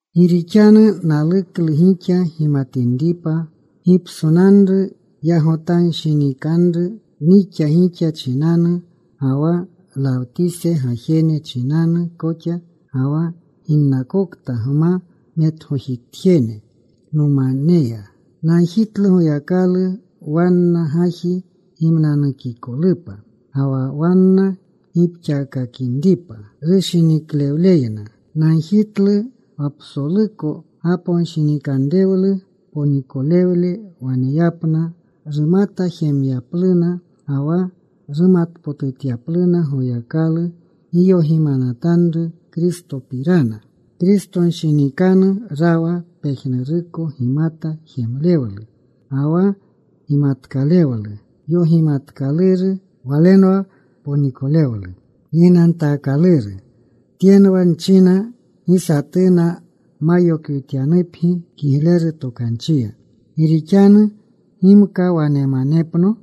Gi rixanu naluklu gixa gimatinripa gipsonanru yagotanshinikanru nixa gixa chinanu ga wa Lawtise gajene chinanu koxa, ga wa ginnakokta nma metgojijetjene nomaneya. Nagjitlu Goyakalu wanna gaji gimnanukikolupa, ga wa wanna gipxaakakinripa rushiniklewleyna. Nagjitlu wa psoluko gaponshinikanrewlu ponikolewle waneyapna rumata jemyapluna, ga wa rumatpotutyapluna Goyakalu giyogimanatanru Kristopirana. Kristonshinikanu rawa pejnuruko gimata jemlewlu ga wa gimatkalewlu yogimatkaluru. Walenwa ponikolewlu gignantaakaluru. Tyenwa nchina, gi satuna ma yokwityanupgi kigleru tokanchiya. Gi rixanu gimka wanemanepno,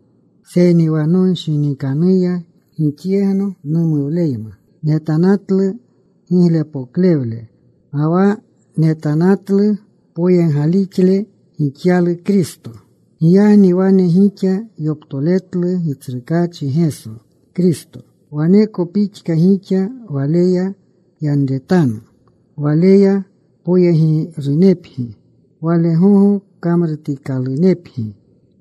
seyni wa nonshinikanuya gixyegno numuwleyma. Netanatlu giglepoklewle ga wa netanatlu poyeggalixle gixyalu Kristo. Giyagni wane gixa yoptoletlu Gitsrukaachi Geso Kristo, waneko pixka gixa Waleya yanretanu. Waleya poyegirunepgi. Wale gogo kamrutikalunepgi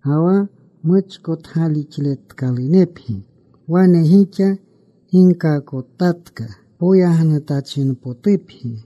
ga wa muchkotgalixletkalunepgi, wane gixa ginkaakotatka. Poyagnutachinpotupgi.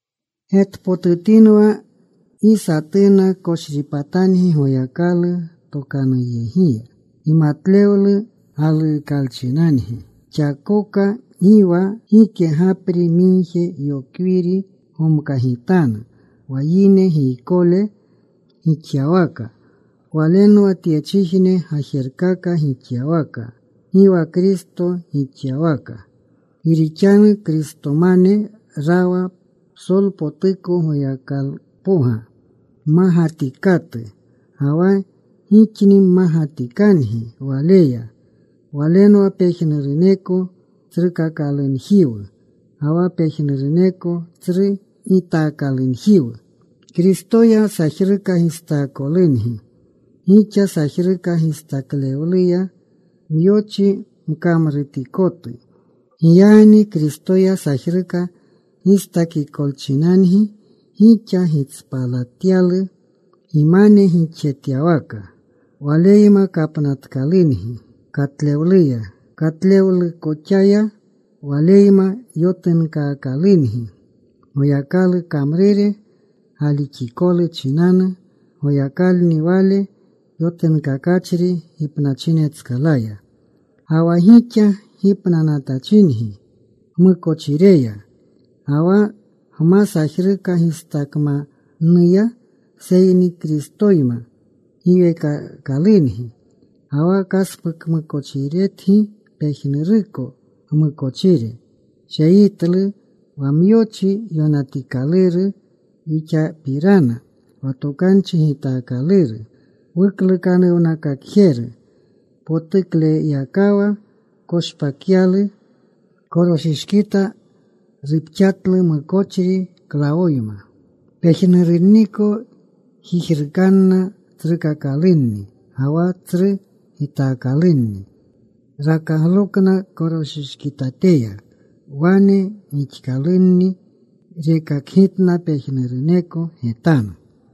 Getpotutinwa gi satuna koshripatangi Goyakalu tokanuyegiya, gimatlewlu galukalchinangi. Xakoka gi wa gike gapri migje yokwiri gomkagitanu wa yine giykole gixyawaka. Walenwa tyechijne gajerkaka gixyawaka, gi wa Kristo gixyawaka. Gi rixanu Kristomane rawa psolpotuko Goyakalpoga mmagatikatu. Ga wa gixni mmagatikangi Waleya. Walenwa pejnuruneko tsrukakalunjiwu ga wa pejnuruneko tsru gitaakalunjiwu. Kristoya sajruka gistaakolungi gixa, sajruka gistaklewluya myochi mkamrutikotu. Giyagni Kristoya sajruka gistakikolchinangi gixa gitspalatyalu gimane gixjetyawaka. Waleyma kapnatkalungi katlewluya. Katlewlukoxaya Waleyma yotunkaakalungi, Goyakalu kamrure galixikolu chinanu. Goyakalni Wale yotunkakachri gipnachinetskalaya. Ga wa gixa gipnanatachingi gmukochireya ga wa gma sajruka gistakmannuya, seyni Kristoyma giweekaakalungi. Ga wa kaspukmukochiretgi pejnuruko gmukochire. Sheyitlu wa myochi yonatikaluru wixapirana wa tokanchi gitaakaluru wuklukanuwnakakanatjeru. Potuklewakaya koshpakyalu. Koroshishkita ruxpatlu mukochri klawoyma. Pejnurunniko jijrukanna tsrukakalunni ga wa tsru gitakalunni. Rakaglokna koroshishkitateya. Wane gixkalunni rekakgitna pejnuruneko getanu.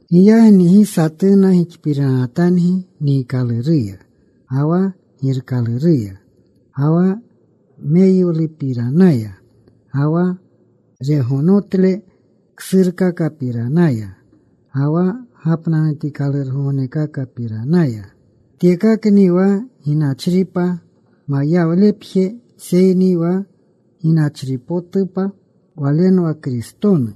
Giyagni gi satuna gixpiranatangi niikaluruya, ga wa girkaluruya, ga wa meyiwlupiranaya ga wa regonotle ksurkakapiranaya, ga wa gapnanutikalurgognekakapiranaya. Tyekakni wa ginachripa mayawlepje, seyni wa ginachripotupa Walenwa Kristonu.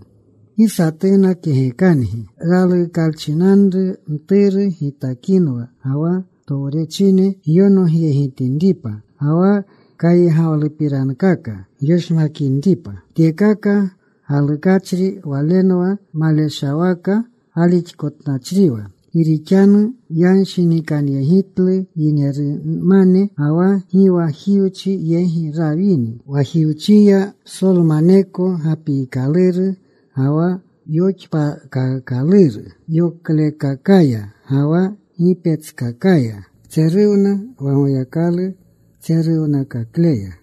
Gi satuna kegekangi raluukalchinanru mturu gitakinwa ga wa towrechine gyonogyegitinripa, ga wa kaygawlupirankaka gyoshmakinripa. Tyekaka galukachri walenwa maleshawaka galixkotnachriwa, gi rixanu yanshinikanyegitlu yinerumane. Ga wa gi wa Jiwchi yegi rawini. Wa Jiwchiya psolmaneko gapiikaluru ga wa yoxpaakaakaluru yoklekakaya ga wa gipetskakaya. Tseruwna wa Goyakalu tseruwnakakleya.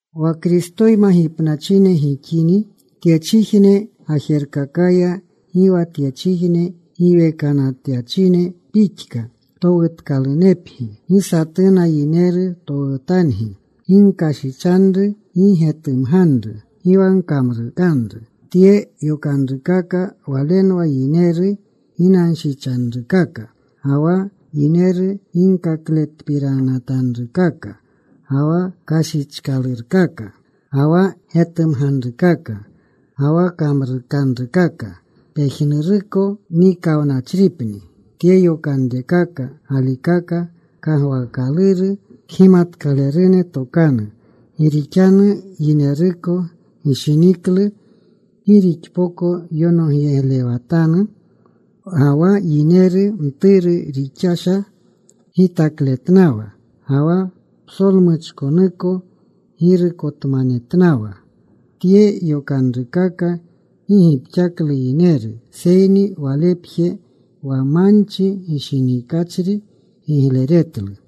Wa Kristoyma gipnachine gixini tyechijne gajerkakaya, gi wa tyechijne giwekanatyachine pixka towutkalunepgi. Gi satuna yineru towutangi, “Gi gkashichanru. Gi getumganru. Gi wa gkamrukanru.” Tye yokanrukaka walenwa yineru ginanshichanrukaka, ga wa yineru ginkakletpiranatanrukaka. Ga wa kashichanrukaka, ga wa getumganrukaka, ga wa kamrukanrukaka pejnuruko nikawnachripni. Tye yokanrekaka galikaka kagwaakaluru kgimatkalerune tokanu, gi rixanu yineruko gishiniklu gi rixpoko yonogyeglewatanu ga wa yineru mturu rixasha gitakletnawa, ga wa psolmuchkonuko girukotmanetnawa. Tye yokanrukaka gi gipxaklu yineru, seyni walepje, wa manchi gishinikachri gigleretlu.